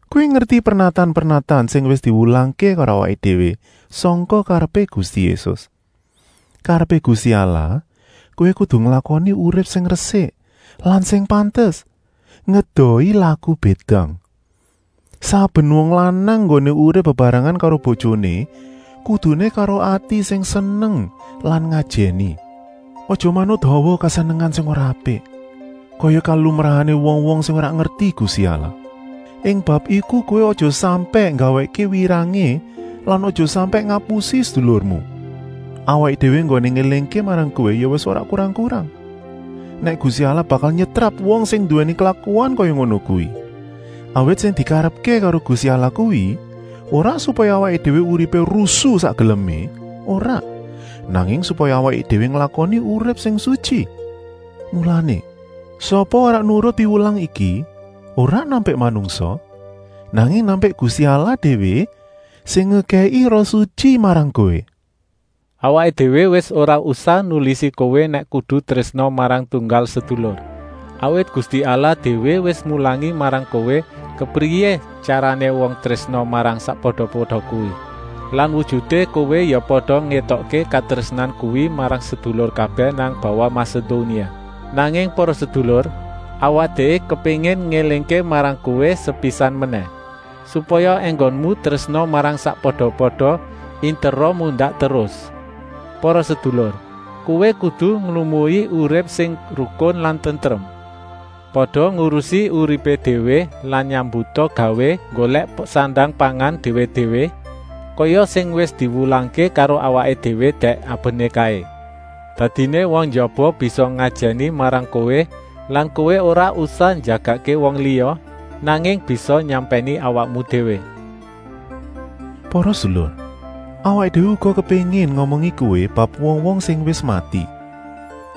Kowé ngerti pernatan-pernatan sing wis diwulangké karo awaké déwé sangka karepé Gusti Yésus. Karepé Gusti Allah kowé kudu nglakoni urip sing resik lan sing pantes, ngedohi laku bédang. Saben wong lanang enggoné urip bebarengan karo bojoné kuduné karo ati sing seneng lan ngajèni. Aja manut hawa kesenengan sing ora apik, kaya kalumrahané wong-wong sing ora ngerti Gusti Allah. Ing bab iku kowé aja sampèk nggawèkké wirangé lan aja sampèk ngapusi sedulurmu. Awaké déwé enggoné ngélingké marang kowé ya wis ora kurang-kurang, nèk Gusti Allah bakal nyetrap wong sing nduwèni klakuan kaya ngono kuwi. Awit sing dikarepké karo Gusti Allah kuwi ora supaya awaké déwé uripé rusu sak gelemé, ora, nanging supaya awaké déwé nglakoni urip sing sutyi. Mulané, sapa ora nurut piwulang iki, ora nampik manungsa, nanging nampik Gusti Allah déwé sing ngekèki Rohé Sutyi marang kowé. Awaké déwé wis ora usah nulisi kowé nèk kudu trésna marang tunggal sedulur, awit Gusti Allah déwé wis mulangi marang kowé kepriyé tyarané wong trésna marang sakpada-pada kuwi. Lan wujuté kowé ya pada ngétokké katrésnan kuwi marang sedulur kabèh nang bawah Masedonia. Nanging para sedulur, awaké déwé kepéngin ngélingké marang kowé sepisan menèh, supaya enggonmu trésna marang sakpada-pada intera mundak terus. Para sedulur, kowé kudu nglumui urip sing rukun lan tentrem. Pada ngurusi uripé déwé lan nyambuta gawé nggolèk sandang-pangan déwé-déwé, kaya sing wis diwulangké karo awaké déwé dèk abené kaé. Dadiné wong njaba bisa ngajèni marang kowé lan kowé ora usah njagakké wong liya, nanging bisa nyampèni awakmu déwé. Para sedulur! Awaké déwé uga kepéngin ngomongi kowé bab wong-wong sing wis mati,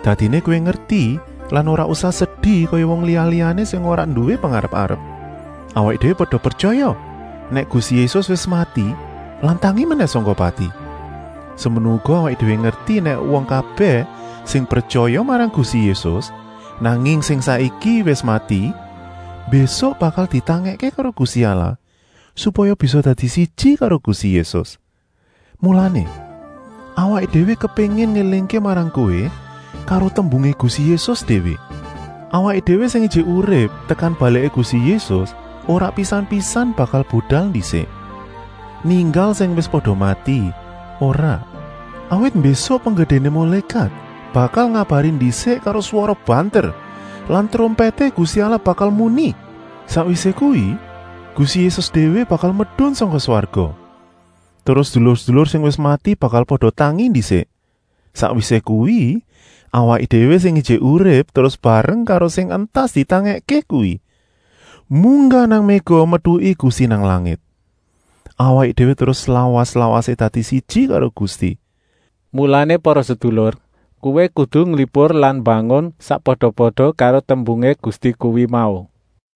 dadiné kowé ngerti lan ora usah sedi kaya wong liya-liyané sing ora nduwé pengarep-arep. Awaké déwé pada pretyaya nèk Gusti Yésus wis mati lan tangi menèh sangka pati? Semono uga awaké déwé ngerti nèk wong kabèh sing pretyaya marang Gusti Yésus, nanging sing saiki wis mati, mbésuk bakal ditangèkké karo Gusti Allah, supaya bisa dadi siji karo Gusti Yésus. Mulané, awaké déwé kepéngin ngélingké marang kowé karo tembungé Gusti Yésus déwé: awaké déwé sing ijik urip tekan baliké Gusti Yésus ora pisan-pisan bakal budal ndisik, ninggal sing wis pada mati, ora. Awit mbésuk penggedéné mulékat bakal ngabari ndisik karo swara banter lan trompèté Gusti Allah bakal muni. Sakwisé kuwi Gusti Yésus déwé bakal medun sangka swarga. Terus sedulur-sedulur sing wis mati bakal pada tangi ndisik. Sakwisé kuwi, awaké déwé sing ijik urip terus bareng karo sing entas ditangèkké kuwi, munggah nang méga metuki Gusti nang langit. Awaké déwé terus slawas-lawasé dadi siji karo Gusti. Mulané para sedulur, kowé kudu nglipur lan mbangun sakpada-pada karo tembungé Gusti kuwi mau.